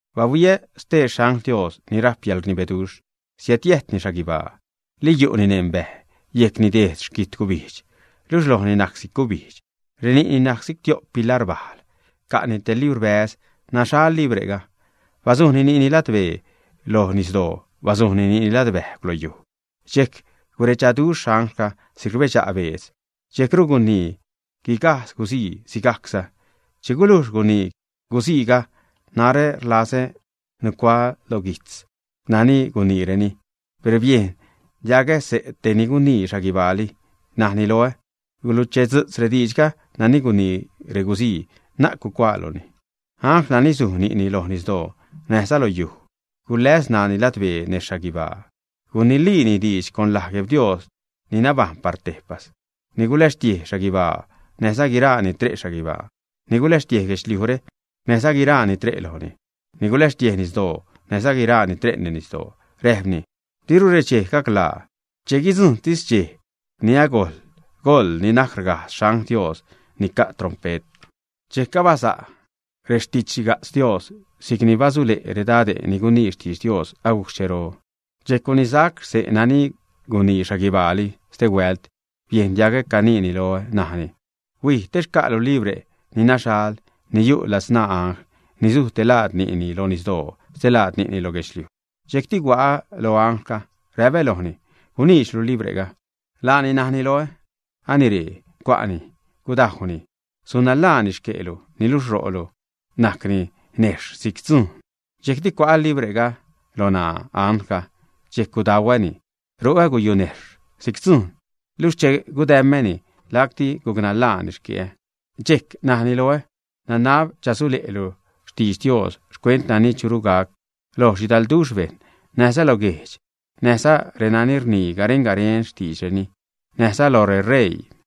Bahuiä stee xangl Dios ni rajp yäḻrnibeduxh, siädjiäjtni xhaguibaa, li yu'ni neṉ bäj, yejcni dejd xquitgubijdx, luxh lojni najc si'c gubijdx. Reni'ni najc si'c tio'p pilajr bajl. Ca'ni te librbäze', naxhal libre'ga. Bazujni ni'ni ladbee loj nisdoo, bazujni ni'ni ladbäjgw lo yuj, dxejc guredxaduxh anglga si'c rbedxa' beedz. Dxejcru gunii guigajdz guzii sigajcsa. Che gulujx gunii guziiga, narä rlazä nucuaä lo guijtz nani guniireni, per biejn diagä xse' tej ni gunii xhaguibaali, najni loä: ―Guluchedzu'tz rediidxga nani gunii reguzii, na'c gucuaaluni. Angl nani suj ni'ni loj nisdoo näjza loj yuj, guläs ṉaani ladbee nez xhaguibaa. Guniliini diidx con laj GuebDios ni nabajṉ par tejpas, ni guläxtiej xhaguibaa näjza guiraa ni tre' xhaguibaa; ni guläxtiej guedxliujre näjza guiraa ni tre' lojni; ni guläxtiej nisdoo näjza guiraa ni tre' neṉ nisdoo. Räjpni: ―Diru redxejre gaclaa. Che guidzujṉtis dxej ni agojl goḻ ni najc rgajdz xangl Dios ni ca' trompe't, dxejc abaza' rextidxxhiga'tz Dios, si'c ni basule' redade' ni gunii xtidx Dios agujc xchero. Dxejc gunisac xse' nani gunii xhaguibaali, stehuält biejn diagä caniini loä, najni: ―Huij, te xca'lu libre' ni naxhal ni yu' ladzṉaa angl ni suj te laad ni'ni loj nisdoo, stelaad ni'ni lo guedxliuj. Dxejcti hua'ä lo anglga, räpä lojni: ―Guniidxlu libre'ga. Laani najni loä: ―Anire, cua'ni, gudajwni. Sun nanḻaani xque'lu, niluxh ro'lu sajcni nejxh si'c dzujn. Dxejcti cua'ä libre'ga lo ṉaa anglga, dxejc gudauäni. Ro'ä guyu'ni nejxh si'c dzujn, luxh che gudäm̲äni, lacti guc nanḻaani xque'ä. Dxejc najni loä: ―Nanab chasulesaclu xtidx Dios xcuent nani churu gac loj xhidalduxh bejṉ, näjza guejdx, näjza renani rnii garen-garen xtiidxreni, näjza loj reṟeii.